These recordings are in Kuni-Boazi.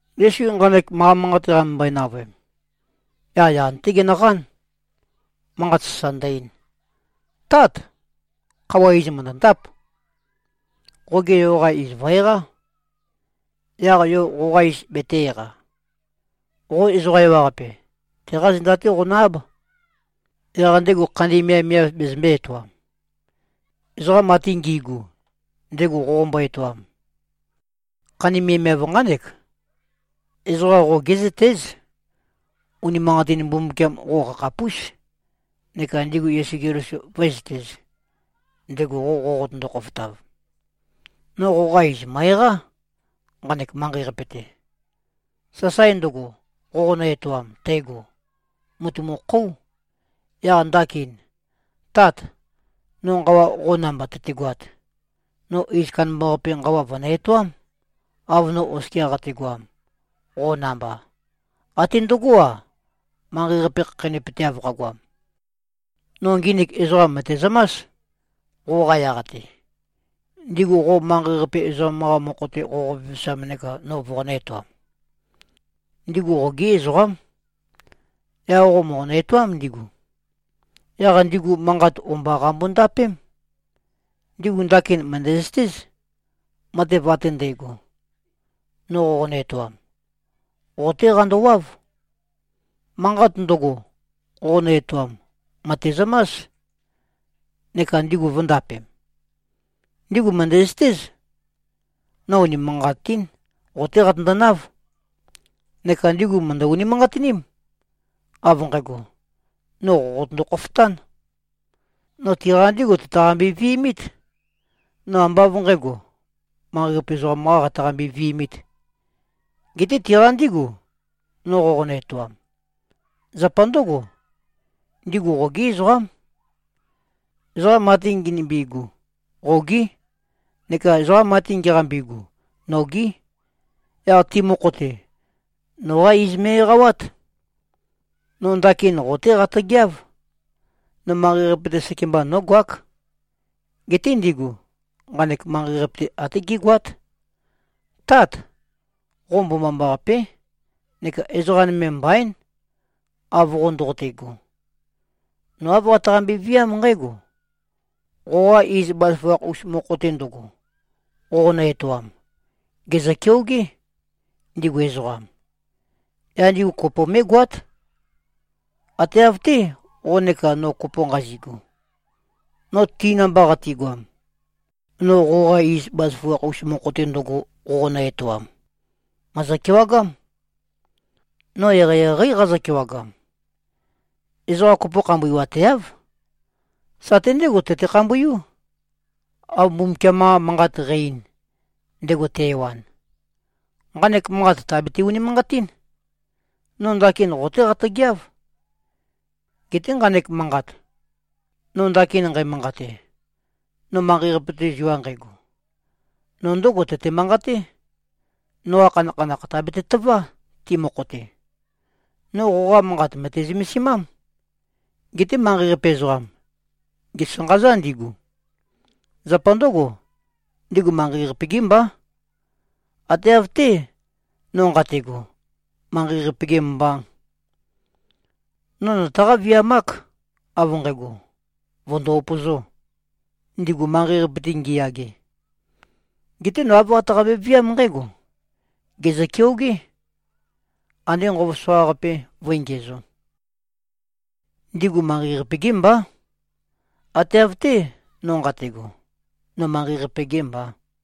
Yesu nqanek manqa manqate qamømbøe-navøem, yaq yan-té genøqán, manqat sasa ndø-ein, “Tát! Khøuwa iz mø̀ndøndáp. Qoge yo-qa iz vø̀-eqá, yaq yo qoqa iz betē-eqa. Qo ezoqa ewaqape, teqá zenda-té qonø-áb. Yaq ndego khandi miavmiav bezømbē-etoam, ezoqam ate ngi꞉gu, ndego qoqombo-etoam. Khandi miavmiav nqánek: Ezoqa qo gé꞉zøtéz. Unimanqatin Mbumbukiam qo qakhapús. Neka ndigu Yesu Keliso vǿezøtēz, ndego qo qoqotøndo-khofotav. No qoqa iz mø̀e-eqá, nqanek manqei-qape-te. Sasae ndøgo, qoqonø-etoam tægo, mùtumukhóu. Yaq ndakin, Tat, no nqawa qo namba tøtegoat, no iz kandambaqape nqawa vø̀nø-etoám, av no oskia qategoam, qo namba, até ndøgó-a, manqei-qape khakheinøpøteav qagoam. No nginik ezoqam mø̀tezømás, qoqa yaq-te, ndigu qo manqei-qape ezoqam-qa mokho-te qoqo-vevesam neka no voqonø̄-etoam. Ndigu qogí ezoqám. Yaq qo mòqonø-etoám ndigu. Yaq ndigu manqat o-mba qambo-ndapém. Ndigu ndakin mø̀ndæzøtéz, matev ate ndægo, no qoqonø-etoam, qo-té qandowáv. Manqat ndøgo, qoqonø-etoam, mø̀tezømás, neka ndigu vø̄ndapem. Ndigu mø̀ndæzøtéz, no unimanqatín qo-té qatøndonáv. Neka ndigu mø̀ndø-unimanqatiním, av nqægo, no qo qotøndo-khofotán. No tiqa ndígu tøtaqambe-vi꞉mít. No ambá av nqǣgo, manqei-qape ezoqam-qá qataqambe-vi꞉mīt, geté tiqa ndígu, no qoqonø-etoam. Zapa ndǿgo, ndigu qogí ezoqám. Ezoqa ate nginømbi꞉gu, qogí. Neka ezoqa ate ngiqambi꞉gu, nogí. Yaq ti mokho-te, noqá iz me꞉-eqawát. No ndakin qo-té qatøgeáv. No manqei-qape-te sekemba nógoák. Geté ndigu, nqanek manqei-qape-te até gégoát. Tát! Qo mbomambaqapé, neka ezoqa nøme mbaín, av qo ndoqote꞉go. No āv qataqambe-viám nqǽgo: Qoqa iz bazaføgakh-us mokho-te ndøgo, qoqonø-etoam, gèzø-keogé, ndigu ezoqam. Yaq ndigu kopo mé꞉goát, ate av-té, qo neka no kopo nqazi꞉gu. No ti namba qatigoam, no qoqa iz bazaføgakh-us mokho-te ndøgo, qoqonø-etoam, mø̀ezø-kewagám. No eqeieqeí qazø-kewagam. Ezoqa kopo khambuiwateáv. Sate ndégo tøte-khambuiú, av Mbumbukiam-qa Manqat qæ-ein, ndego te-ewan. Nqanek manqat tàbete-unimanqatín. No ndakin qo-té qatøgeáv. Geté nqanek manqat, no ndakin nqæmanqate, no manqei-qape-te zua nqægo, no ndǿgo tøte-manqaté, noqa khanakhanakh tàbete-tøvá, ti mokho-te. No qoqa manqat mø̀te-zømesimám. Geté manqei-qape ezoqam, gèsanqazá ndigu. Zapa ndǿgo, ndigu manqei-qape-gí mbá, ate av-té, no nqate꞉go, manqei-qape-gē mbā. No nøtaqá-viamák, av nqægo, vø̀ndo-upøzō, ndigu manqei-qape-te ngiyage. Geté no āv qataqambe-viám nqǽgo: Gèzø-keogé. Andé nqova soqaqape vǿe-ngiæzō. Ndigu manqei-qape-gí mbá, ate av-té, no nqate꞉go, no manqei-qape-gē mbā.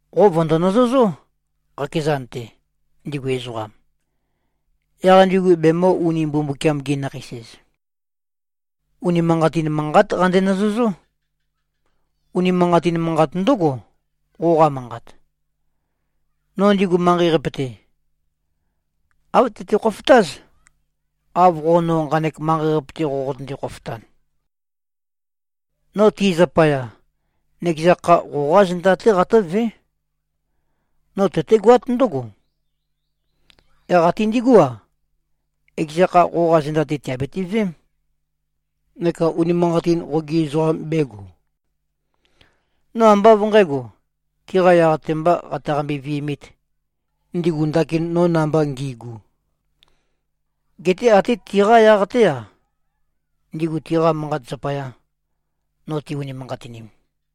Qo vø̀ndo-nøzøzó, qakezan-te, ndigu ezoqam. Yaq ndigu bemø̄-uni-Mbumbukiam-gi-nakheis-ez. Unimanqatin manqát qande-nøzøzó. Unimanqatin manqat ndǿgo, qoqa manqat. No ndigu manqei-qape-te, āv tøte-khofotáz, av qo no nqanek manqei-qape-te qoqotønde-khofotan. No ti zapaya, nøkeza kha, qoqá zenda-té qatǿvé. No tøtégoát ndǿgo, yaq até ndigú-a, ekeza kha qoqa zenda-te tìabiti-veém, neka unimanqatin qogi ezoqam bēgo. No ambá av nqǣgo, tiqa yaq-te mbā qataqambe-vi꞉mīt, ndigu ndakin no namba ngi꞉gu, geté até tiqá yaq-té-a, ndigu tiqa manqat zapaya, no ti-unimanqatinim.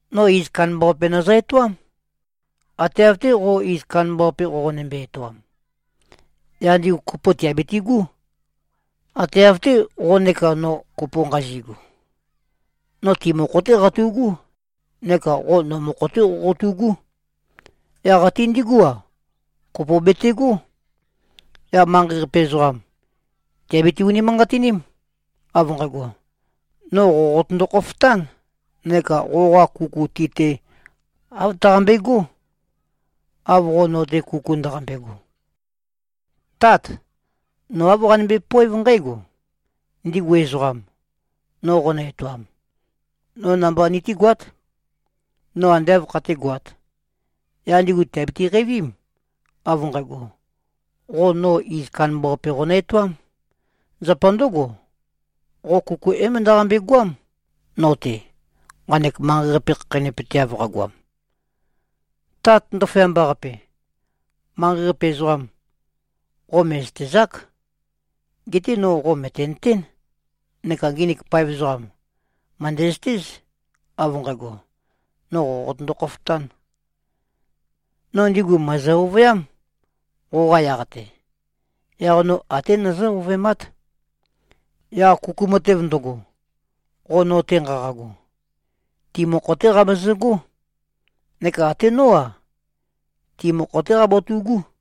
No iz kandambaqape nøzø-etoám, ate av-té, qo iz kandambaqape qoqonømbe-etoam. Yaq ndigu kopo tìabitigú, ate av-té, qo neka no kopo nqazi꞉gu. No ti mokho-té qatu꞉gú neka qo no mokho-té qoqotu꞉gú. Yaq até ndigú-a, kopo betegó. Yaq manqei-qape ezoqam, tìabiti-unimanqatiním, av nqægo, no qo qotøndo-khofotān neka qoqa kuku ti-te, āv tøqambegó, av qo no-te kuku ndaqambe꞉go. Tát! No āv qanømbe-poév nqǽgo: Ndigu ezoqam, no qonø-etoam, no namba nitígoát, no ande āv khatégoāt. Yaq ndigu tìabiti-qeivím, av nqægo, qo no iz kandambaqape qonø-etoám. Zapa ndǿgo, qo kuku é-møndøqambe-goám no-te, nqanek manqei-qape khakheinøpøteav qagoam. Tat ndaføyamba-qape! Manqei-qape ezoqam, qo mè꞉zøtezák. Geté no qo mø̀tenøtén. Neka nginik paev ezoqam, mø̀ndæzøtéz, av nqægo, no qo qotøndo-khofotān. No ndigu mø̀ezø-ovøyám, qoqa yaq-te. Yaq no até nøzǿ-ovøemát. Yaq kuku matev ndøgo, qo no-te nqaqago, ti mokho-té qabezøgó. Neka até nó-a, ti mokho-té qabatu꞉gú.”